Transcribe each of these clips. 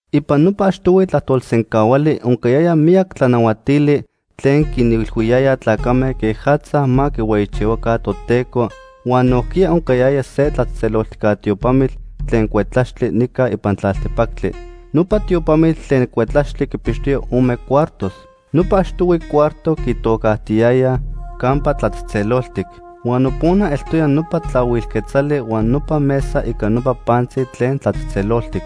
Ipan nopa achtohui tlajtolsencahuali oncayaya miyac tlanahuatili tlen quinilhuiyaya tlacame quejatza ma quihueyichihuaca Toteco huan nojquiya oncayaya se tlatzejtzeloltijca tiopamitl tlen cuetlaxtli nica ipan tlaltepactli. Nopa tiopamitl tlen cuetlaxtli quipixtoya ome cuartos. Nopa achtohui cuarto quitocajtiyayaj “Campa Tlatzejtzeloltic”, huan nopona eltoya nopa tlahuil quetzali huan nopa mesa ica nopa pantzi tlen tlatzejtzeloltic.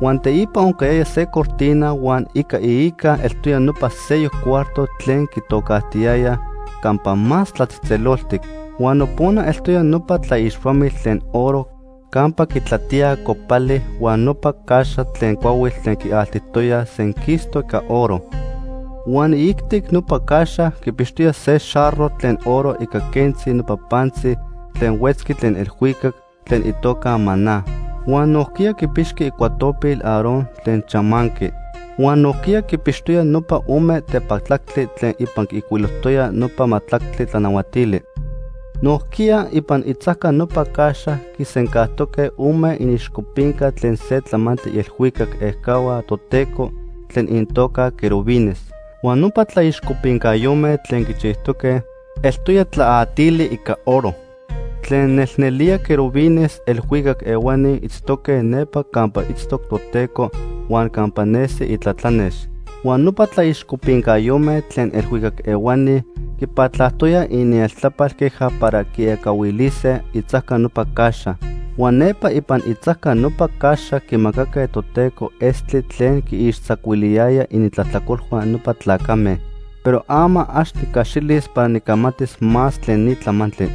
Huan teipa oncayaya se cortina huan ica iica eltoya nopa seyoc cuarto tlen quitocajtiyayaj “Campa Más Tlatzejtzeloltic”. Huan nopona eltoya nopa tlaixpamitl tlen oro campa quitlatíaj copali huan nopa caxa tlen cuahuitl tlen quialtijtoyaj senquistoc ica oro. Huan iijtic nopa caxa quipixtoya se xarro tlen oro ica quentzi nopa pantzi tlen huetzqui tlen elhuicac tlen itoca maná. Huan nojquiya quipixqui icuatopil Aarón tlen chamanqui. Huan nojquiya quipixtoya nopa ome tepatlactli tlen ipan quiijcuilojtoya nopa majtlactli tlanahuatili. Nojquiya, ipan itzajca nopa caxa quisencajtoque ome iniixcopinca tlen se tlamantli ielhuicac ejcahua Toteco tlen inintoca querubines. Huan nopa tlaixcopincayome tlen quichijtoque, eltoya tlaatili ica oro. Tlen nelnelía querubines elhuicac ehuani itztoque nepa campa itztoc Toteco huan campa nesi itlatlanex. Huan nopa tlaixcopincayome tlen elhuicac ehuani quipatlajtoyaj inieltlapal queja para quiecahuilise itzajca nopa caxa. Huan nepa ipan itzajca nopa caxa quimacaque Toteco estli tlen quiixtzacuiliyaya inintlajtlacolhua nopa tlacame. Pero ama ax nicaxilis para nicamatis más tlen ni tlamantli.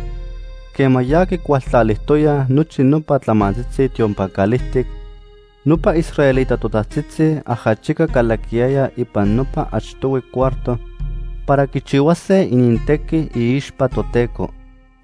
Quema ya quicualtlalijtoyaj nochi nopa tlamantzitzi tiopan calijtic, nopa israelita totajtzitzi ajachica calaquiyayaj ipan nopa achtohui cuarto para quichihuase inintequi iixpa Toteco.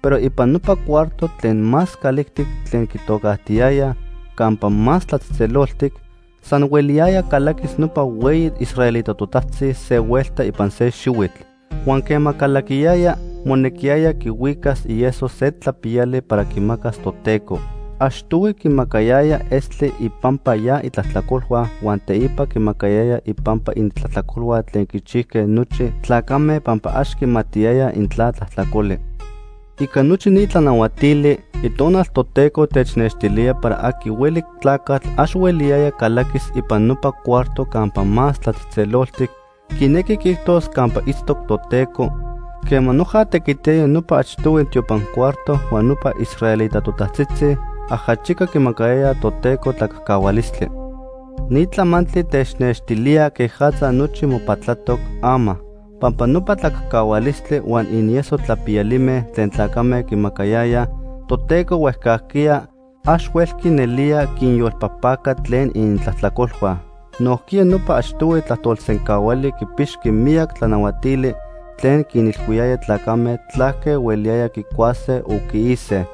Pero ipan nopa cuarto tlen más calijtic tlen quitocajtiyayaj “Campa Más Tlatzejtzeloltic”, san hueliyaya calaquis nopa hueyi israelita totajtzi se huelta ipan se xihuitl. Huan quema calaquiyaya, monequiyaya quihuicas ieso se tlapiyali para quimacas Toteco. Achtohui quimacayaya estli ipampa ya itlajtlacolhua huan teipa quimacayaya ipampa inintlajtlacolhua tlen quichijque nochi tlacame pampa ax quimatiyayaj intla tlajtlacoli. Ica nochi ni tlanahuatili, Itonal Toteco technextilía para aqui hueli tlacatl ax hueliyaya calaquis ipan nopa cuarto Campa Más Tlatzejtzeloltic, quinequi quiijtos campa itztoc Toteco, quema noja tequitiyaya nopa achtohui tiopan cuarto huan nopa israelita totajtzitzi ajachica quimacayayaj Toteco tlacajcahualistli. Ni tlamantli technextilía quejatza nochi mopatlatoc ama. Pampa nopa tlacajcahualistli huan inieso tlapiyalime tlen tlacame quimacayayaj Toteco huejcajquiya, ax huelqui nelía quinyolpajpaca tlen inintlajtlacolhua. Nojquiya nopa achtohui tlajtolsencahuali quipixqui miyac tlanahuatili tlen quinilhuiyayaj tlacame tlaque hueliyaya quicuase o quiise.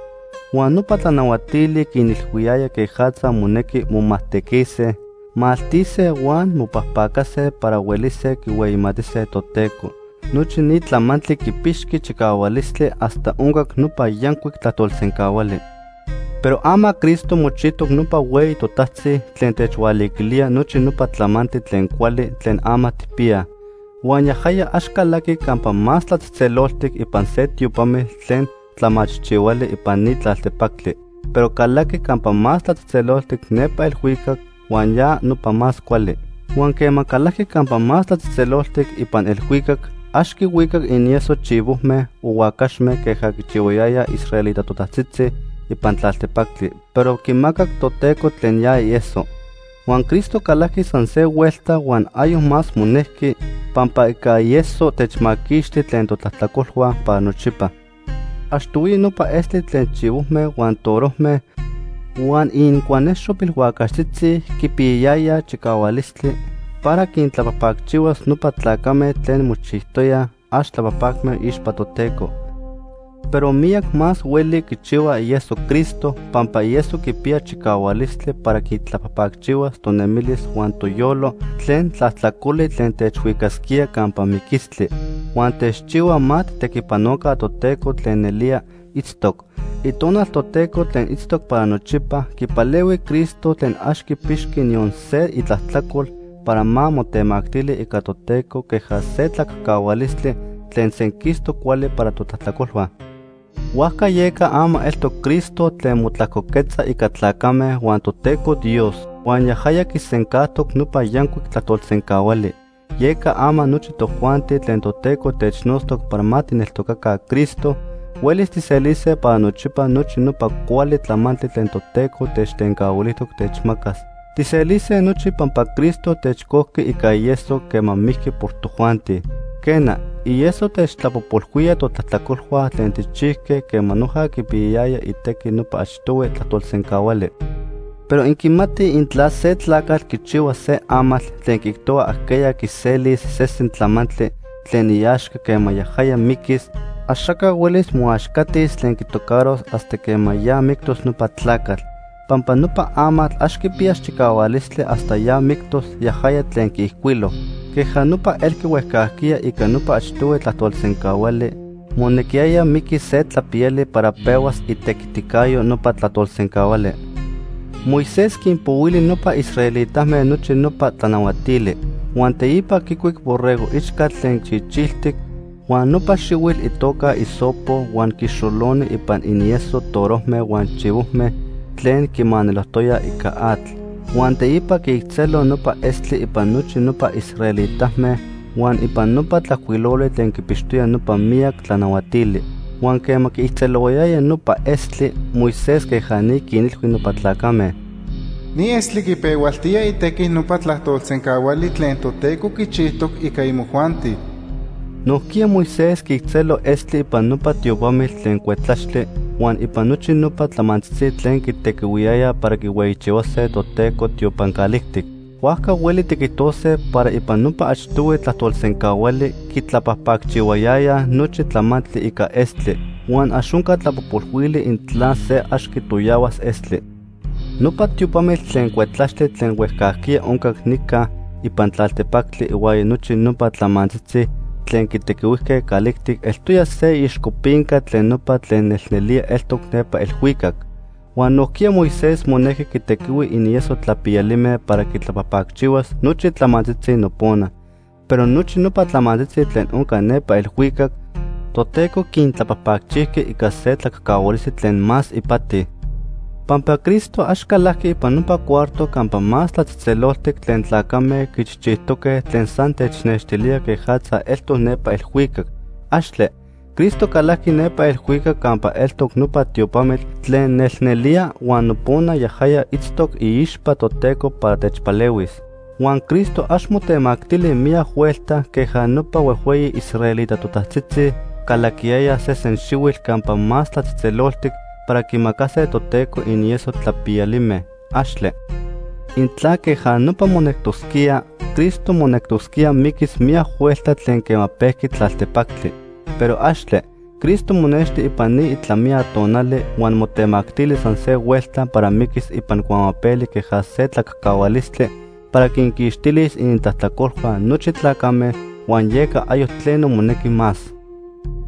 Huan nopa tlanahuatili quinilhuiyayaj quejatza monequi momajtequise, maltise huan mopajpacase para huelise quihueyimatise Toteco. Nochi ni tlamantli quipixqui chicahualistli hasta oncac nopa yancuic tlajtolsencahuali. Pero ama Cristo mochijtoc nopa Hueyi Totajtzi tlen techhualiquilía nochi nopa tlamantli tlen cuali tlen ama tijpiyaj. Huan yajaya ax calajqui Campa Más Tlatzejtzeloltic ipan se tiopamitl tlen tlamachijchihuali ipan ni tlaltepactli, pero calajqui Campa Más Tlatzejtzeloltic nepa elhuicac huan ya nopa más cuali. Huan quema calajqui Campa Más Tlatzejtzeloltic ipan elhuicac ax quihuicac inieso chivojme o huacaxme queja quichihuayayaj israelita totajtzitzi ipan tlaltepactli, pero quimacac Toteco tlen ya ieso. Huan Cristo calajqui san se huelta huan ayoc más monejqui, pampa ica ieso techmaquixti tlen totlajtlacolhua para nochipa. Achtohuiya nopa estli tlen chivojme huan torojme, huan inincuanexo pilhuacaxtzitzi quipiyayaya chicahualistli para quintlapajpacchihuas nopa tlacame tlen mochijtoyaj ax tlapajpacme iixpa Toteco. Pero miyac más hueli quichihua ieso Cristo, pampa ieso quipiya chicahualistli para quitlapajpacchihuas tonemilis huan toyolo tlen tlajtlacoli tlen techhuicasquía campa miquistli. Huan techchihua ma tijtequipanoca Toteco tlen nelía itztoc. Itonal Toteco tlen itztoc para nochipa quipalehui Cristo tlen ax quipixqui niyon se itlajtlacol, para ma motemactili ica Toteco queja se tlacajcahualistli tlen senquistoc cuali para totlajtlacolhua. Huajca yeca ama eltoc Cristo tlen motlajcoquetza ica tlacame huan Toteco Dios, huan yajaya quisencajtoc nopa yancuic tlajtolsencahuali. Yeca ama nochi tojuanti tlen Toteco technotztoc para ma tijneltocaca Cristo, huelis tijselise para nochipa nochi nopa cuali tlamantli tlen Toteco techtencahuilijtoc techmacas. Tijselise nochi pampa Cristo techcojqui ica ieso quema mijqui por tojuanti. Quena, ieso techtlapojpolhuía totlajtlacolhua tlen tijchijque quema noja quipiyayaya itequi nopa achtohui tlajtolsencahuali. Pero inquimatij intla se tlacatl quichihua se amatl tlen quiijtohua ajqueya quiselis sesen tlamantli tlen iaxca quema yajaya miquis, axaca huelis moaxcatis tlen quitocaros hasta quema ya mictos nopa tlacatl. Pampa nopa amatl ax quipiyas chicahualistli hasta ya mictos yajaya tlen quiijcuilo. Queja nopa elqui huejcajquiya ica nopa achtohui tlajtolsencahuali, monequiyaya miquis se tlapiyali para pehuas itequiticayo nopa tlajtolsencahuali. Moisés quinpohuili nopa israelitame nochi nopa tlanahuatili. Huan teipa quicuic borrego ichcatl tlen chichiltic huan nopa xihuitl itoca hisopo huan quixoloni ipan inieso torojme huan chivojme tlen quimanelojtoya ica atl. Huan teipa quiijtzelo nopa estli ipan nochi nopa israelitame huan ipan nopa tlajcuiloli tlen quipixtoya nopa miyac tlanahuatili. Huan quema quiijtzelohuayaya nopa estli, Moisés queja ni quinilhui nopa tlacame: “Ni estli quipehualtía itequi nopa tlajtolsencahuali tlen Toteco quichijtoc ica imojuanti.” Nojquiya Moisés quiijtzelo estli ipan nopa tiopamitl tlen cuetlaxtli huan ipan nochi nopa tlamantzitzi tlen quitequihuiyayaj para quihueyichihuase Toteco tiopan calijtic. Huajca hueli tiquijtose para ipan nopa achtohui tlajtolsencahuali, quitlapajpacchihuayayaj nochi tlamantli ica estli. Huan ax onca tlapojpolhuili intla se ax quitoyahuas estli. Nopa tiopamitl tlen cuetlaxtli tlen huejcajquiya oncac nica ipan tlaltepactli ihuaya nochi nopa tlamantzitzi tlen quitequihuijque calijtic eltoya se iixcopinca tlen nopa tlen nelnelía eltoc nepa elhuicac. Huan nojquiya Moisés monejqui quitequihui inieso tlapiyalime para quitlapajpacchihuas nochi tlamantzitzi nopona, pero nochi nopa tlamantzitzi tlen onca nepa elhuicac, Toteco quintlapajpacchijqui ica se tlacajcahualistli tlen más ipati. Pampa Cristo ax calajqui ipan nopa cuarto Campa Más Tlatzejtzeloltic tlen tlacame quichijchijtoque tlen san technextilía quejatza eltoc nepa elhuicac. ¡Axtle! Cristo calajqui nepa elhuicac campa eltoc nopa tiopamitl tlen nelnelía huan nopona yajaya itztoc iixpa Toteco para techpalehuis. Huan Cristo ax motemactili miyac huelta queja nopa huejhueyi israelita totajtzitzi calaquiyayaj sesen xihuitl Campa Más Tlatzejtzeloltic para quimacase Toteco inieso tlapiyalime. ¡Axtle! Intla queja nopa monectosquía, Cristo monectosquía miquis miyac huelta tlen quema pejqui tlaltepactli. ¡Pero axtle! Cristo monexti ipan ni itlamiya tonali huan motemactili san se huelta para miquis ipan cuamapeli queja se tlacajcahualistli para quinquixtilis inintlajtlacolhua nochi tlacame huan yeca ayoc tleno monequi más.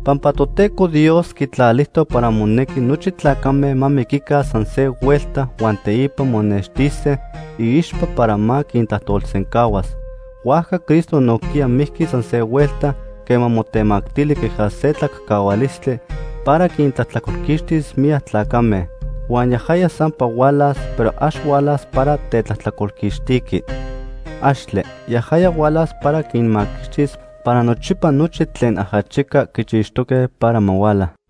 Pampa Toteco Dios quitlalijtoc para monequi nochi tlacame ma miquica san se huelta huan teipa monextise iixpa para ma quintlajtolsencahuas. Huajca Cristo nojquiya mijqui san se huelta quema motemactili queja se tlacajcahualistli para quintlajtlacolquixtis miyac tlacame. Huan yajaya sampa hualas, pero ax hualas para tetlajtlacolquixtiqui. ¡Axtle! Yajaya hualas para quinmaquixtis para nochipa nochi tlen ajachica quichixtoque para ma huala.